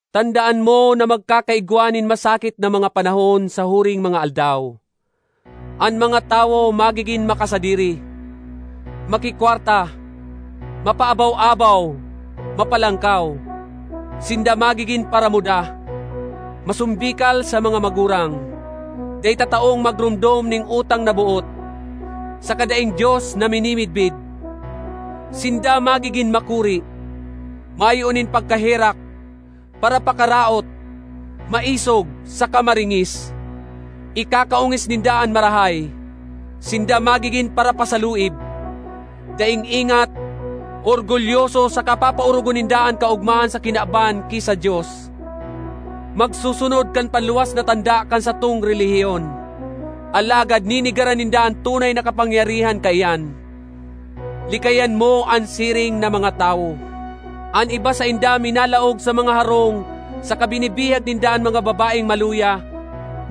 Tandaan mo na magkakaigwa nin masakit na mga panahon sa huring mga aldaw. An mga tawo magigin makasadiri, makikwarta, mapaabaw-abaw, mapalangkaw; sinda magigin paramuda, masombikal sa mga magurang, dai tataong magromdom nin utang na boot, saka daing Dios na minimidbid; sinda magigin makuri, mayo nin pagkaherak, parapakaraot, maisog, saka maringis; ikakaongis ninda an marahay; sinda magigin parapasaluib, daing ingat, orgulyoso saka papaorogon ninda an kaogmahan sa kinaban ki sa Dios; magsusunod kan panluwas na tanda kan satong relihiyon, alagad nenegaran ninda an tunay na kapangyarihan kaiyan. Likayan mo an siring na mga tawo. An iba sainda minalaog sa mga harong saka binibihag ninda an mga babaeng maluya,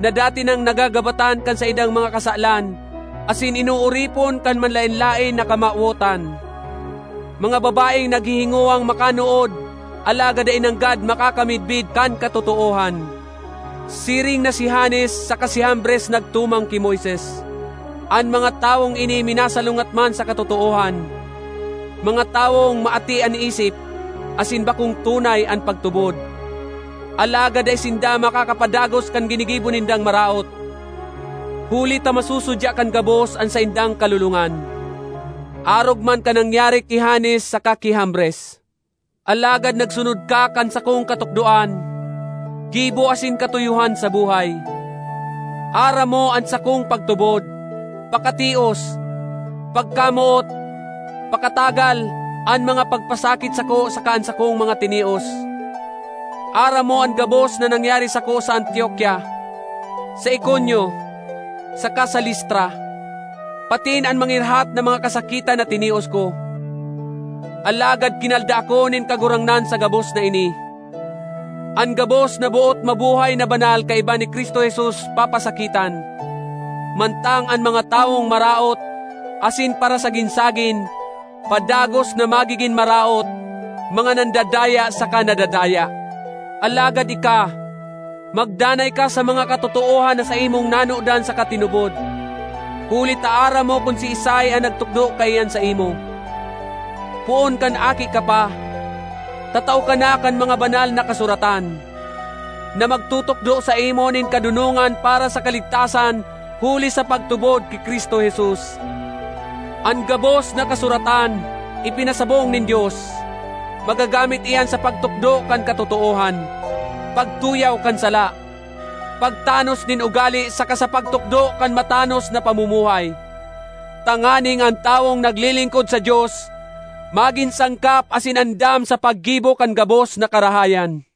na dati nang nagagabatan kan saindang mga kasalan asin inooripon kan manlaen-laen na kamawotan— mga babaeng naghihingowang makanood alagad dai nanggad makakamidbid kan katotoohan. Siring na si Janes saka si Jambres nagtumang ki Moises, an mga tawong ini minasalungat man sa katotoohan—mga tawong maati an isip, asin bakong tunay an pagtubod. Alagad dai sinda makakapadagos kan ginigibo nindang maraot, huli ta masusudya kan gabos an saindang kalolongan, arog man kan nangyari ki Janes saka ki Jambres. Alagad nagsunod ka kan sakong katukdoan, gibo asin katuyohan sa buhay; aram mo an sakong pagtubod, pakatios, pagkamoot, pakatagal, an mga pagpasakit sako saka an sakong mga tinios. Aram mo an gabos na nangyari sako sa Antiokia, sa Iconio, saka sa Listra, patin an mangirhat na mga kasakitan na tinios ko. Alagad kinalda ako nin Kagurangnan sa gabos na ini. An gabos na boot mabuhay na banal kaiba ni Cristo Jesus papasakitan, mantang an mga tawong maraot asin parasagin-sagin, padagos na magigin maraot, mga nandadaya saka nadadaya. Alagad ika, magdanay ka sa mga katotoohan na saimong nanodan saka tinubod, huli ta aram mo kun siisay an nagtukdo kaiyan saimo. Poon kan aki ka pa, tatao ka na kan mga Banal na Kasuratan, na magtutukdo saimo nin kadonongan para sa kaligtasan huli sa pagtubod ki Cristo Jesus. An gabos na Kasuratan ipinasabong nin Dios; magagamit iyan sa pagtukdo kan katotoohan, pagtuyaw kan sala, pagtanos nin ugale saka sa pagtukdo kan matanos na pamumuhay, tanganing an tawong naglilingkod sa Dios magin sangkap asin andam sa paggibo kan gabos na karahayan.